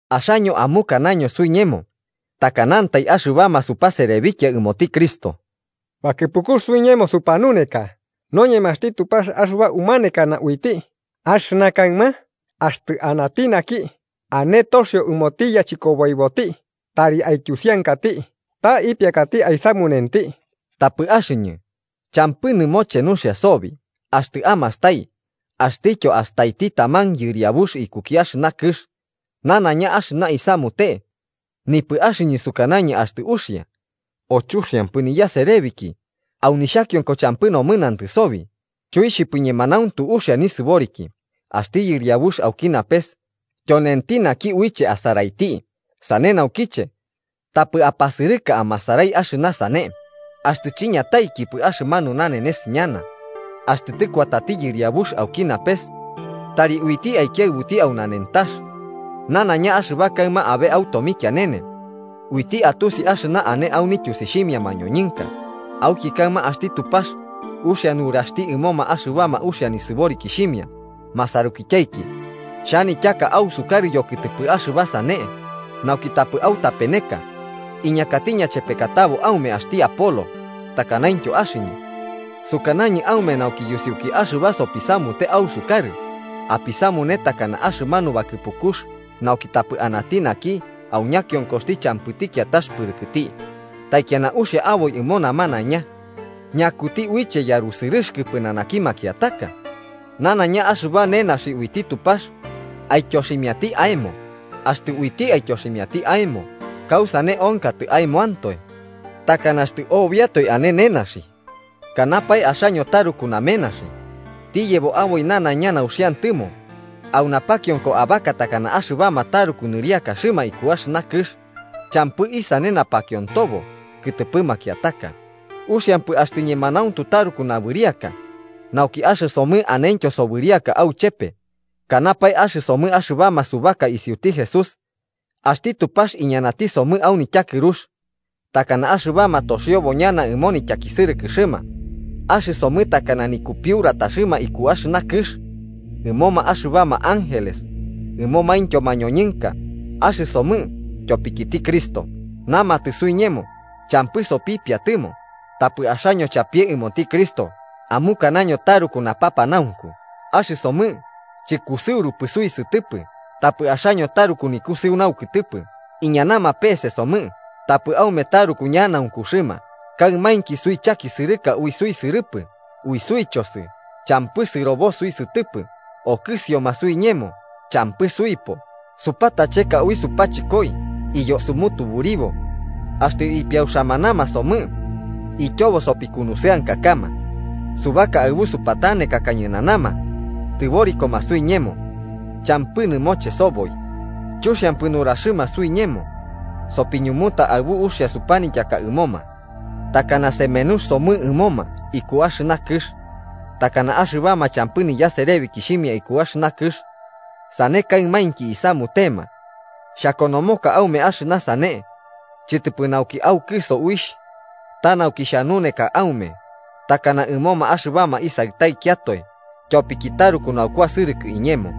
Axaño amukanaño suiñemo takanantai axɨbama supaserebikia ɨmoti Cristo, bakɨpukux suiñemo supanuneka noñemaxti Tupax axɨba umanekana uiti. Axɨna kaɨma, axtɨ anati naki ane toxio ɨmoti yachɨkoboiboti tari aityusiankati ta ipiakati aisamunenti. Tapɨ axɨñɨ, champɨ nɨmoche nuxia sobi axtɨ amastai axtɨtyo astaiti taman yɨriabux ikuki axɨna kɨx nanaiña axɨna isamute. Nipɨ axɨñɨ sukanañɨ axtɨ uxia o chuxiampɨ niyaserebiki. Au nixhakionko champɨ nomɨnantɨ sobi, chuixhipɨ ñemanauntu uxia nisɨboriki. Axti Yɨriabux auki napes tyonenti naki uiche asaraiti. Sane naukiche, tapɨ apasɨrɨka amasarai axɨna sane axtɨ chiñataikipɨ axɨmanu nanenes ñana. Axtɨ tɨkuatati Yɨriabux auki napes tari uiti aikiaɨbuti au nanentax nanaiña axɨba kaɨma abe au tomikianene, uiti atusi axɨna ane au nityusixhimia mañoñɨnka. Auki kaɨma axti Tupax uxia nuraxti ɨmoma axɨbama uxia nisɨborikixhimia. Masarukityaiki, xhanityaka ausukarɨ yokɨtɨpɨ axɨba sane nauki tapɨ autapeneka, iñakati ñachepekatabo aume axti Apolo takanaintyo axɨñɨ. Sukanañɨ aume nauki yusiuki axɨba sopisamute ausukarɨ apisamune takana axɨmanu bakɨpukux, nauki tapɨ anati naki au ñakionkoxti champɨti kiatax pɨrɨkɨti, taikiana uxia aboi ɨmo namanaiña. ¿Ñakuti uiche yarusɨrɨxɨkɨ pɨnanaki makiataka? Nanaiña axɨba nenaxi uiti Tupax aityoximiati aemo. Axtɨ uiti aityoximiati aemo, ¿kausane onkatɨ aemoantoe, takana axtɨ obiatoe ane nenaxi? Kanapae, axaño taruku namenaxi, tiyebo aboi nanaiña nauxiantɨmo, au napakionko abaka takana axɨbama taruku nɨriakaxɨma iku axɨna kɨx champɨ isane napakiontobo kɨtɨpɨ makiataka. ¡Uxiampɨ axtɨ ñemanauntu taruku nabɨriaka, nauki axɨsomɨ anentyo sobɨriaka auchepe! Kanapae axɨsomɨ axɨbama subaka isiuti Jesús, axti Tupax iñanati somɨ au nityakɨrux, takana axɨbama toxiobo ñana ɨmo nityakisɨrɨkɨxɨma. Axɨsomɨ takana nikupiurataxɨma iku axɨna kɨx ɨmoma axɨbama ángeles ɨmomaintyo mañoñɨnka. Axɨsomɨ, tyopikiti Cristo, namatɨ suiñemo champɨ sopipiatɨmo. Tapɨ axaño chapie ɨmoti Cristo, amukanaño taruku napapanaunku. Axɨsomɨ chɨkusɨurupɨ suisɨtɨpɨ, tapɨ axaño taruku nikusɨu naukɨtɨpɨ. Iñanama pese somɨ, tapɨ aume taruku ñanaunkuxɨma. Kaɨmainki suichakisɨrɨka ui suisɨrɨpɨ, ui suichosɨ champɨ sɨrobo suisɨtɨpɨ. Okɨsioma suiñemo, champɨ suipo. Supatacheka ui supachɨkoi iyo sumutuburibo. Axtɨ ipiauxamanama somɨ ityobo sopikunusɨankakama. Subaka aɨbu supatanekaka ñɨnanama, tɨborikoma suiñemo, champɨ nɨmoche soboi. Chuxiampɨ nuraxɨma suiñemo, sopiñumuta aɨbu uxia supanityaka ɨmoma. Takana semenux somɨ ɨmoma iku axɨna kɨx, takana axɨbama champɨ niyaserebikixhimia iku axɨna kɨx. Sane kaɨmainki isamutema. Xhakonomoka aume axɨna sane, chɨtɨpɨ nauki aukɨso uixh, ta nauki xhanuneka aume, takana ɨmoma axɨbama isaɨtaikiatoe, tyopiki taruku naukuasɨrɨkɨ iñemo.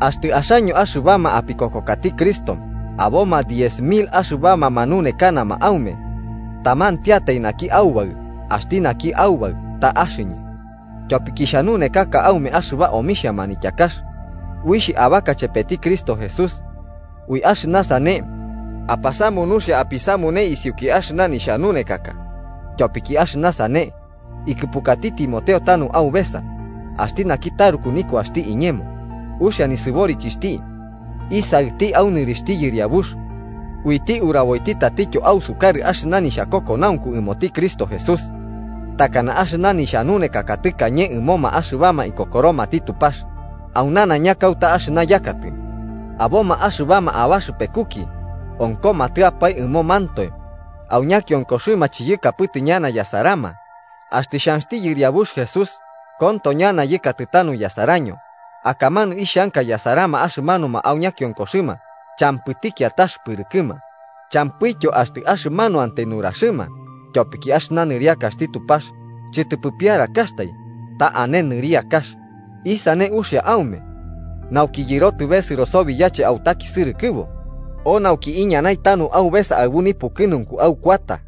Axtɨ axaño axɨbama apikokokati Cristo, aboma diez mil axɨbama manunekanama aume, tamantiatai naki aubaɨ. Axti naki Aubaɨ ta axɨñɨ, tyopiki xhanunekaka aume axɨba omixhia manityakax uixh abaka chepeti Cristo Jesús. Ui axɨna sane, apasamu nuxia apisamune isiuki axɨna nixhanunekaka. Tyopiki axɨna sane ikɨpukati Timoteo tanu aubesa, axti naki taruku nikuaxti iñemo uxia nisɨborikixhti isaɨti au nɨrixhti Yɨriabux. Uiti uraboiti tatityo ausukarɨ axɨna nixhakokonaunku ɨmoti Cristo Jesús, takana axɨna nixhanunekaka tɨkañe ɨmoma axɨbama ikokoromati Tupax au nanaiña kauta axɨna yakatɨ. Aboma axɨbama abaxɨpekuki onkomatɨapae ɨmomantoe au ñakionkoxɨma chiyɨkapɨtɨ ñana yasarama. Axtɨ xhanxti Yɨriabux Jesús, konto ñana yɨkatɨ tanu yasaraño. Akamanu ixhanka yasarama axɨmanuma au ñakiokoxɨma champɨti kiatax pɨrɨkɨma, champɨityo axtɨ axɨmanuantai nuraxɨma. Tyopiki axɨna nɨriakaxti Tupax chɨtɨpɨ piarakaxtai, ta ane nɨriakax. ¿Isane uxia aume: nauki yɨrotɨ besɨro sobi yache autakisɨrɨkɨbo? ¿O nauki iñanai tanu aubesa aɨbu nipukɨnunku aukuata?